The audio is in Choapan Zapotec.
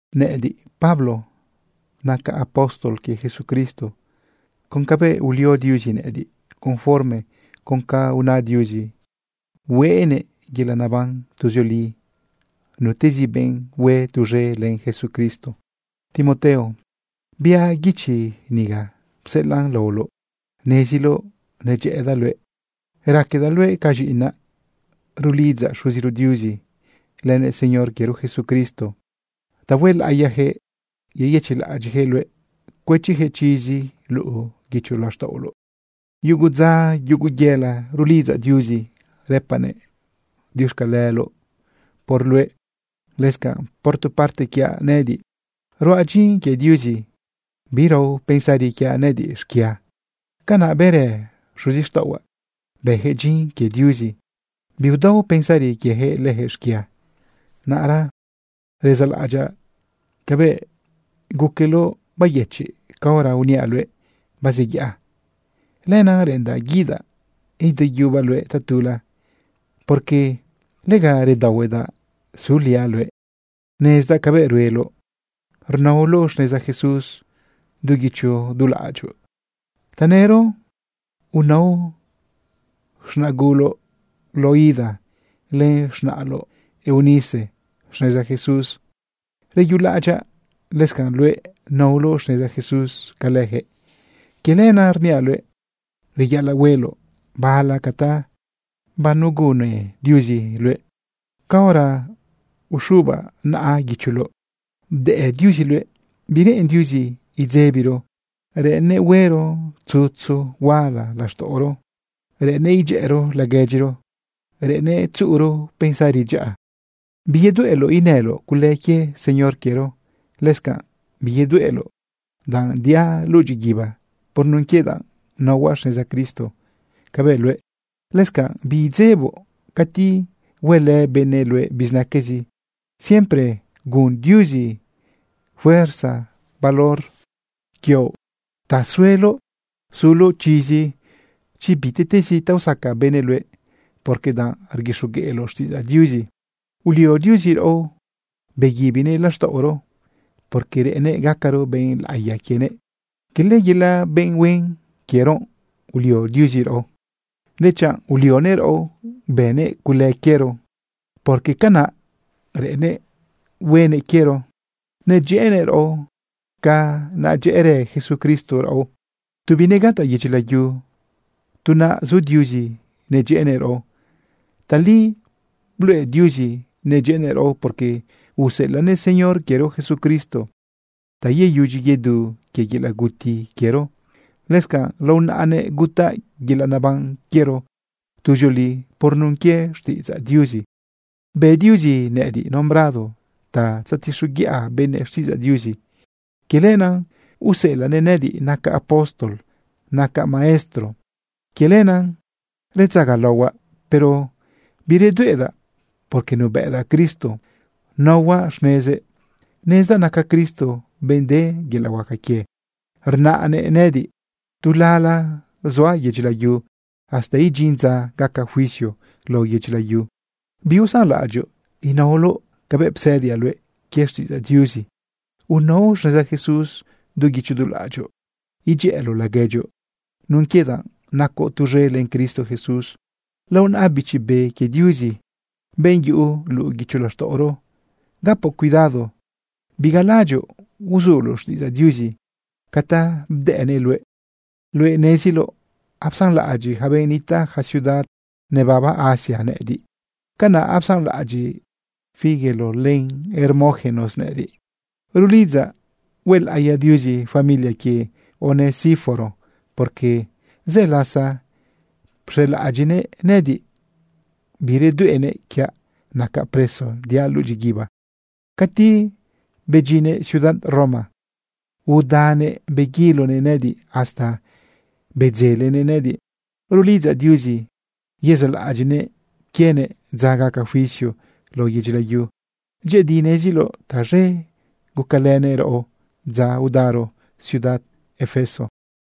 Nëꞌëdiꞌ, Pablo, nacaꞌ apóstol quie Jesucristo con cabëꞌ ulio Diuzi nëꞌëdiꞌ conforme con ca una Diuzi hueꞌnëꞌ yelaꞌ naban tuzioli nutezi benꞌ hue tuz̃e len Jesucristo. Timoteo, biaꞌ guichi niga pseꞌelaꞌn laoloꞌ. Neziloꞌ nadyëꞌëdaꞌ luëꞌ, raquedaꞌ luëꞌ ca z̃iꞌinaꞌ. Rulidzaꞌ Xuziro Diuzi lënëꞌ Señor quiero Jesucristo ta huelaꞌiyaquëꞌ yeyëchiꞌlaꞌadyiꞌyaquëꞌ luëꞌ cuëchiyaquëꞌ chizi luꞌu guicho laxtaꞌoloꞌ. Yugo dza, yugo yëla, rulidzaꞌ Diuzi rëpaꞌnëꞌ diuxcaleloꞌ por luëꞌ. Lëscanꞌ, por tu parte quiaꞌ nëꞌëdiꞌ, ruaꞌ dyin quie Diuzi birao pensari quiaꞌ nëꞌëdiꞌ xquia. Canaꞌ bërë xuzixtaꞌohuaꞌ, bëyaquëꞌ dyin quie Diuzi, biudao pensari quieyaquëꞌ leyaquëꞌ xquia. Naꞌra rezalaꞌadyaꞌ cabëꞌ guqueloꞌ bayëchiꞌ caora uniaꞌ luëꞌ bazeyaꞌa. Lenaꞌ reꞌendaꞌ guidaꞌ ideyubaꞌ luëꞌ tatula, porque lega redaohuedaꞌ suliaꞌ luëꞌ. Nezdaꞌ cabëꞌ rueloꞌ rnaoloꞌ xneza Jesús du guicho du laꞌadyoꞌ. Tanëro unao z̃naꞌguloꞌ Loida len z̃naꞌloꞌ Eunice xneza Jesús. Reyulaꞌadyaꞌ lëscanꞌ luëꞌ naoloꞌ xneza Jesús ca leyaquëꞌ. Quie lenaꞌ rniaꞌ luëꞌ: Reyaꞌalaꞌ hueloꞌ bala ca ta banegunne Diuzi luëꞌ caora uxubaꞌ naꞌa guicholoꞌ bdëꞌ Diuzi luëꞌ. Bireꞌen Diuzi idzebiro, reꞌennëꞌ huero tzutzu huala laxtaꞌoro, reꞌennëꞌ idyëꞌero laguedyiro, reꞌennëꞌ tzuꞌuro pensari dyaꞌa. Biyedueꞌloꞌ inëloꞌ cule quie Señor quiero. Lëscanꞌ biyedueꞌloꞌ danꞌ diaꞌ luꞌu dyiguiba por nun quie danꞌ naohuaꞌ xneza Cristo cabëꞌ luëꞌ. Lëscanaꞌ biidzeboꞌ cati huelë benëꞌ luëꞌ bizinaquezi. Siempre gun Diuzi fuerza valor quioꞌ ta sueloꞌ suloꞌ chizi chi bitiꞌtezi ta usaca benëꞌ luëꞌ porque danꞌ rguixogueꞌloꞌ xtiꞌidzaꞌ Diuzi. Ulio Diuzi raꞌo beguibinëꞌ laxtaꞌoro, porque reꞌennëꞌ gacaro benꞌ laꞌiya quienëꞌ. Cala yelaꞌ benꞌ huen quiero ulio Diuzi raꞌo, dechanꞌ ulionëꞌ raꞌo bënnëꞌ cule quiero, porque canaꞌ reꞌennëꞌ huenëꞌ quiero nedyëꞌënëꞌ raꞌo ca nedyëꞌërë Jesucristo raꞌo. Tu binegataꞌ yedyi layu, tu naꞌ zu Diuzi nadyëꞌënëꞌ raꞌo. Tali bluꞌe Diuzi nadyëꞌënëꞌ raꞌo, porque useꞌelaꞌnëꞌ Señor quiero Jesucristo ta yeyudyi yedu quie yelaꞌ guti quiero. Lëscanꞌ lao naꞌanëꞌ gutaꞌ yelaꞌ neban quiero tuzioli por nun quie xtiꞌidzaꞌ Diuzi. Bë Diuzi nëꞌëdiꞌ nombrado ta tzetixoguiꞌa benëꞌ xtiꞌidzaꞌ Diuzi. Quie lenaꞌ useꞌelaꞌnëꞌ nëꞌëdiꞌ nacaꞌ apóstol, nacaꞌ maestro. Quie lenaꞌ redzagalaohuaꞌ, pero biredueꞌdaꞌ porque nuebëꞌdaꞌ Cristo, naohuaꞌ xnezëꞌ. Nezdaꞌ naca Cristo benꞌ de yelaꞌ huaca quie, rnaꞌnëꞌ nëꞌëdiꞌ tu lala zuaꞌ yedyi layu hasta idyin dza gaca juicio lao yedyi layu. Biusanlaꞌadyoꞌ inaoloꞌ cabëꞌ psëdiaꞌ luëꞌ quie xtiꞌidzaꞌ Diuzi. Unao xneza Jesús du guicho du laꞌadyoꞌ, idyëꞌëloꞌ laguedyoꞌ nun quie danꞌ nacoꞌ tuz̃e len Cristo Jesús. Lao naꞌa Bichi Be quie Diuzi, benꞌ yuꞌu luꞌu guicho laxtaꞌoro, gapoꞌ cuidado bigalaꞌadyoꞌ uzuloꞌ xtiꞌidzaꞌ Diuzi ca ta bdëꞌnëꞌ luëꞌ. Luëꞌ neziloꞌ apsanlaꞌadyiꞌ yaca benꞌ nitaꞌ yaca ciudad nebaba Asia nëꞌëdiꞌ. Canaꞌ apsanlaꞌadyiꞌ Figelo len Hermógenes nëꞌëdiꞌ. Rulidzaꞌ huelaꞌiya Diuzi familia quie Onesíforo, porque zë lasa pxelaꞌadyiꞌnëꞌ nëꞌëdiꞌ. Biredueꞌnëꞌ quiaꞌ nacaꞌ preso diaꞌ luꞌu dyiguiba. Cati bedyinnëꞌ ciudad Roma udanëꞌ beguilonëꞌ nëꞌëdiꞌ hasta bedzelenëꞌ nëꞌëdiꞌ. Rulidzaꞌ Diuzi yezaꞌlaꞌadyiꞌnëꞌ quienëꞌ dza gaca juicio lao yedyi layu. Dyëꞌëdi neziloꞌ taz̃e gucalënëꞌ raꞌo dza udaro ciudad Efeso.